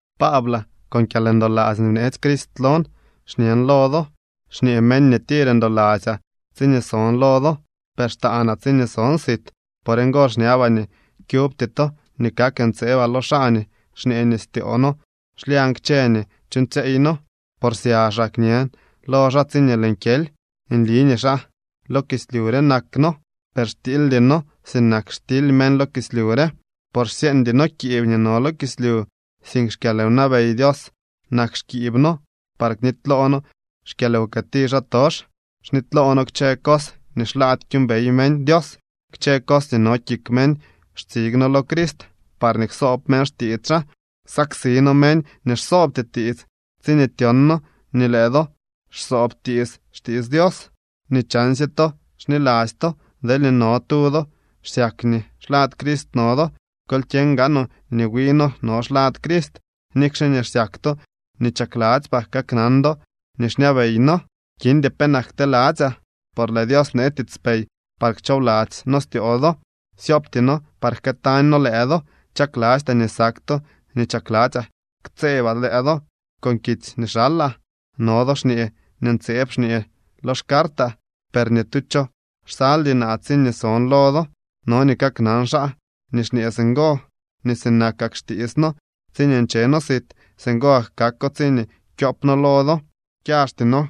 Paablaa, con kyalndoladzy nii bneetsy Crist lon xñen lo do. Xñee meñ nii tir ndoladzyaa tsiñee son lo do, per xtaanaa tsiñee son sit. Por ngo xñabaa nii kyubty to nii kak ntseebaa lo xaa nii xñee nii styoo noo xlyañ kchë nii chuuñtsyeey noo, por syaxaa kñen lo xaa tsiñee lëën kyely. Nli nii xaa lo kislyu re nak noo, per xtiildy noo sinak xtily meñ lo kislyu re. Por xsyeeñdy noo kiib nii no lo kislyu, sink xkyalwnabey Dios nak xkiib noo par knityloo noo xkyalwkëti xaatox. Xnityloo noo kchë cos nii xlaady kyuumbey meñ Dios. Kchë cos nii no kik meñ xtsig noo lo Crist parñee ksoob meñ xtiits xaa. Saksi noo meñ nii xsoobty tiits tsiñee tyon noo nii lëë do xsoob tiits xtiits Dios. Nii chansye to xniladzy to. Deelñee no tu do xsyak nii xlad Crist no do, kol kyeñ gaanoo nii wi noo no xlad Crist. Nikxe nii xsyak to nii chakladzypaa kaknan do nii xñabey noo, kindy penak kteladzyaa. Por lëë Dios bnee tiitspey parñee kchoobladzy noo styoo do. Syoopty noo par jkëëtañ noo lëë do. Chaklastyaa nii sak to nii chakladzyaa ktseebaa lëë do con kitsy nii xalaa. No do xñee nii ntseeb xñee lo xcartaa, per ni tu cho xsaldy naa tsiñee son lo do. No nii kaknan xaa nii xñee singo nii sinakak xtiits noo tsiñee nche noo sit, singo gak kako tsiñee kyoop noo lo do. Xyaxty noo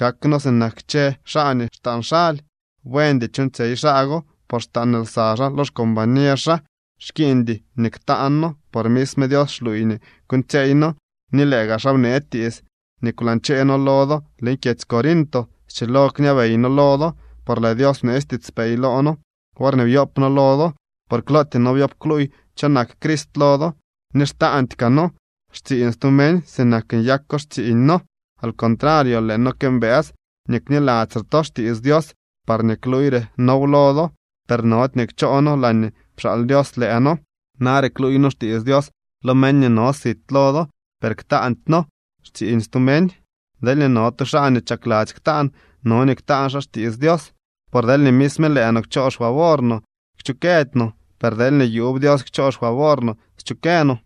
kak noo sinak kchë xaa nii xtaan xaly. Buendy chuuñtsyey xaa go, por xtaan lsa xaa lo xcombañer xaa. Xkiiñdy nii ktaan noo, por misme Dios xluuy nii kuuñtsyeey noo, ni lëë gaa xaa bnee tiits nii kwlañchee noo lo do leñ kyedzy Corinto. Schilo kñabey noo lo do, por lëë Dios bneetsy tiitspey loo noo worñee byoop noo lo do, por klootyee noo byoob kluuy cho nak Crist lo do. Ni xtaandy kaa noo xtsiiñ stu meñ sinak nyako xtsiiñ noo. Al contrario, lëë noo këmbës nii kniladzyre to xtiits Dios parñee kluuyre noow lo do, per nody nii kchoo noo laañee pxaal Dios lëë noo. Nare kluuy noo xtiits Dios lo meñ nii no sit lo do, per ktaandy noo xtsiiñ stu meñ. Deelñee no tu xaa nii chakladzy ktaan, no nii ktaan xaa xtiits Dios. Por deelñee misme lëë no kchoo xfavor no, kchukëdy no. Per deelñee yuub Dios kchoo xfavor no, schukë no.